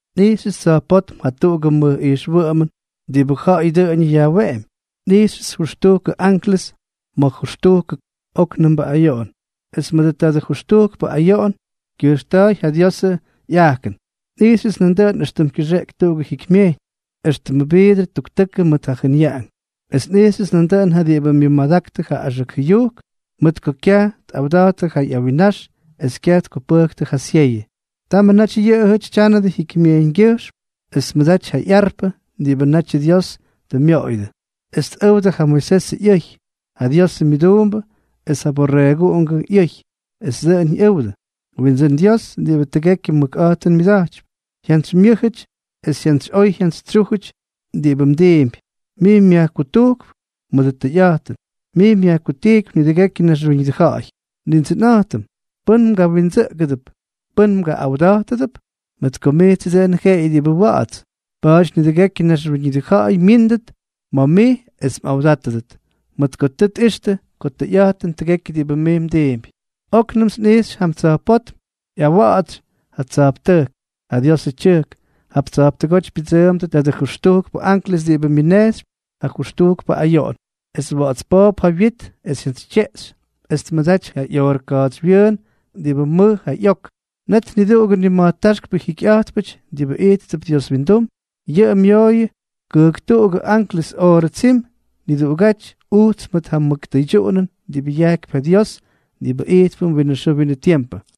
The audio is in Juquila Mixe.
Nꞌijxyʉts tsa̱jpótm jatuꞌugʉ mʉj ijxwʉꞌʉmʉn diꞌibʉ ja̱ꞌa̱y dʉꞌʉñʉ yajweꞌempy. Nꞌijxyʉts jʉxtujkʉ anklʉs mʉt jʉxtujkʉ óknʉmbʉ ayoꞌon. Es mʉdʉ tadʉ jʉxtujkpʉ ayoꞌon kyʉjxta̱ꞌa̱y ja Diosʉ ꞌyajkʉn. Nꞌijxyʉts nandʉꞌʉn éxtʉm kyʉxeꞌeky tuꞌugʉ jikymyejyñ, éxtʉmʉ viidrʉ tuktʉkʉ mʉt ja jʉnyaꞌank. Es nꞌijxyʉts nandʉꞌʉn ja diꞌibʉ myʉmadaktʉ ja axʉk jʉyujk mʉt ko kyaj tꞌawda̱jttʉ ja ꞌyawinnax es kyaj tkupʉjktʉ ja syeyʉ. Tamʉ naty yʉꞌʉjʉty tyánʉdʉ jikymyejyñgyʉjxm, es tmʉdaty ja ꞌyarpʉ diꞌibʉ natyʉ Dios tʉ myoꞌoyʉdʉ, es tꞌʉwdʉ ja Moisesʉ ꞌyʉy, ja Diosʉ myʉduumbʉ, es ja Borreeguꞌungʉ ꞌyʉy. Esʉ dʉꞌʉn ꞌyʉwdʉ: Windsʉ́n Dios diꞌibʉ tʉgekyʉ mʉkꞌa̱jtʉn myʉda̱jtypy, jyantsymyʉ́jʉty es jyantsyꞌoy jyantsytsyújʉty diꞌibʉ mdiimpy. Mij myajkutujkp mʉdʉ tʉyꞌa̱jtʉn, mij myajkutijkypy nidʉgekyʉ naxwíñʉdʉ ja̱ꞌa̱y. Nindsʉnꞌa̱jtʉm, ¿pʉ́n mgawindsʉꞌʉgʉdʉp, pʉ́n mgaꞌꞌawdátʉdʉp? Mʉt ko mijtsʉ dʉn jeꞌeyʉ diꞌibʉ wa̱ꞌa̱ts, pa̱a̱ty nidʉgekyʉ naxwíñʉdʉ ja̱ꞌa̱yʉ myíndʉt ma̱ mij es mꞌawdátʉdʉt, mʉt ko tʉ tꞌixtʉ ko tʉyꞌa̱jtʉn tʉgekyʉ diꞌibʉ mij mdiimpy. Oknʉmts nꞌijxy jam tsa̱jpótm ꞌyawa̱ꞌa̱tsy ja tsa̱jptʉjk, ja Diosʉ tyʉjk. Jap tsa̱jptʉgóty pyʉdsʉʉmdʉ tadʉ jʉxtujkpʉ anklʉs diꞌibʉ myʉnejxypy ja jʉxtujkpʉ ayoꞌon, es wa̱ꞌa̱ts poop ja wyit es jyantsytyeꞌxy, es tmʉdaty ja ꞌyoorʉ ka̱a̱tsywyʉʉn diꞌibʉ mʉj ja ꞌyok. Net niduꞌugʉ nima̱jtáxkpʉ jikyꞌa̱jtpʉty diꞌibʉ ijttʉp Dios windum, yʉꞌʉ myooyʉ kʉjktuꞌugʉ anklʉs oorʉ tsim niduꞌugáty ujts mʉt ja mʉk tʉydyuꞌunʉn diꞌibʉ yajkypy ja Dios diꞌibʉ ijtpʉm winʉ xʉʉ winʉ tiempʉ.